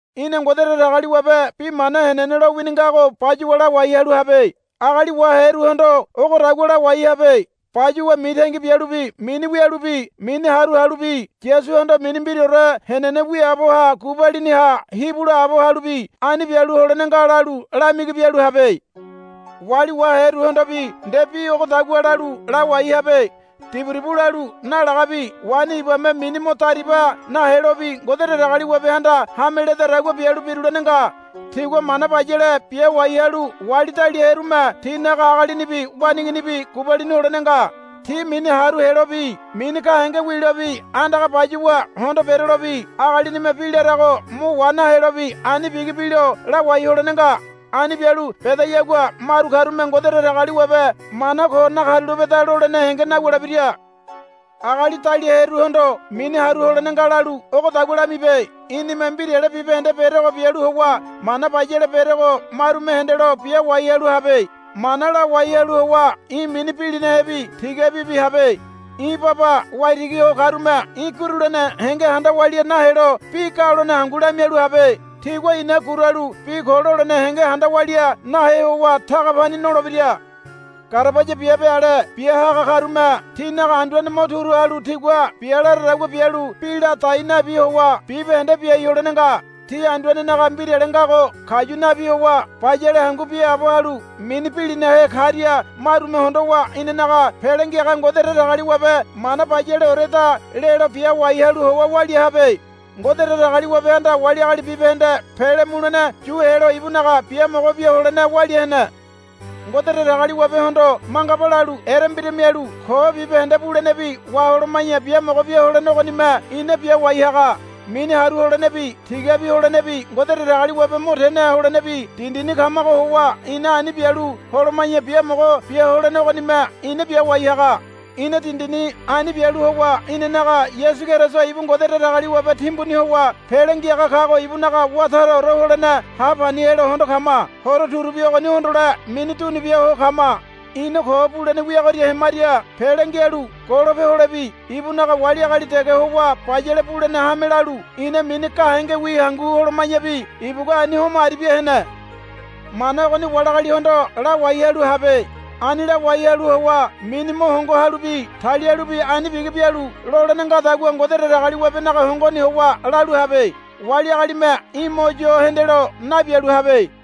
Í̠na Ngode Datagaliwabe bi mana henene lowini ngago bayuwa lawai halu habe. Agali waheruhondo ogodagua lawai habe. Bayuwa mitangi bialubi mini wialubi mini haru halubi Yasuhondo mini mbiraore henene wiaabo ha gubalini ha hibu laabo halubi ani bialu holene nga, lalu lamigi bialu habe. Wali waheruhondobi nde bi ogodagua lalu lawai habe. Diburibu lalu nalagabi waini ibame mini mo dariba nahelobi Ngode Datagaliwabehanda hame ledadagua bialu birulene nga. Tigua mana bayale biawai halu wali daliaherume tinaga agalinibi waneiginibi gubalini holene nga. Ti mini haru helobi mini gahenge wilobi andaga bayuwa hondo berelobi agalinime bi larago mo wa nahelobi ani bigi bilo lawai holene nga. Ani bialu bedayagua maru karume, Ngode Datagaliwabe mana ko nakarulapeda, lolene henge nawulebira. Agali daliaheruhondo, Mini haru holene nga, lalu ogodagua lamibe. Í̠nime mbirale bibahende berego bialu howa mana bayale berego marume hendelo biawai halu habe. Mana lawai halu howa í̠ mini bilinahebi tigabibi habe. Í̠ baba waitigi ho karume í̠ gurulene henge handa walia nahelo bi galone hangu lamialu habe. Tigua ina guralu bi ko lolene henge handa walia nahe howa taga pani nolebira. Garabaya biabe ale biahaga karume tinaga anduane mo turu halu tigua bia laradagua bialu bi la dai nabi howa bibahende biai holene nga. Ti anduanenaga mbirale ngago kayu nabi howa bayale hangu biaabo halu mini bilinahe karia marume hondowa inanaga Pele Ngiaga Ngode Datagaliwabe mana, Bayaleoreda, lelo biawai halu howa walia habe. Ngode Datagaliwabehanda wali agali bibahende pele mulene yu helo ibunaga biamogo bia holene walia hene. Ngode Datagaliwabehondo, Mangaba, lalu erembira mialu ko bibahende bulenebi waholoma̱ya biamogo bia holene ogonime ina biawai haga. Mini haru holenebi tigabi holenebi Ngode Datagaliwabe mo tene holenebi dindini kamago howa ina ani bialu holoma̱ya biamogo biaholene ogonime ina biawai haga. Ina dindini ani bialu howa inanaga Yasu Keriso ibu Ngode Datagaliwabe timbuni howa Pele Ngiaga kago ibunaga wá taraore holene hapani helo hondo kama. Horo turubi ogoni hondole mini dunubia ho kama. Ina ko bulene wiagoria hemaria pele ngialu golope holebi ibunaga wali agali dege howa bayale bulene hame lalu ina mini gahengewi hangu holoma̱yabi ibugua ani homo aribia hene. Mana ogoni wali agalihondo lawai halu habe. Ani lawai halu howa mini mo hongo halubi talialubi ani bigi bialu lolene ngadagua Ngode Datagaliwabenaga hongoni howa lalu habe. Wali agalime í̠ mo yo hendelo nabialu habe.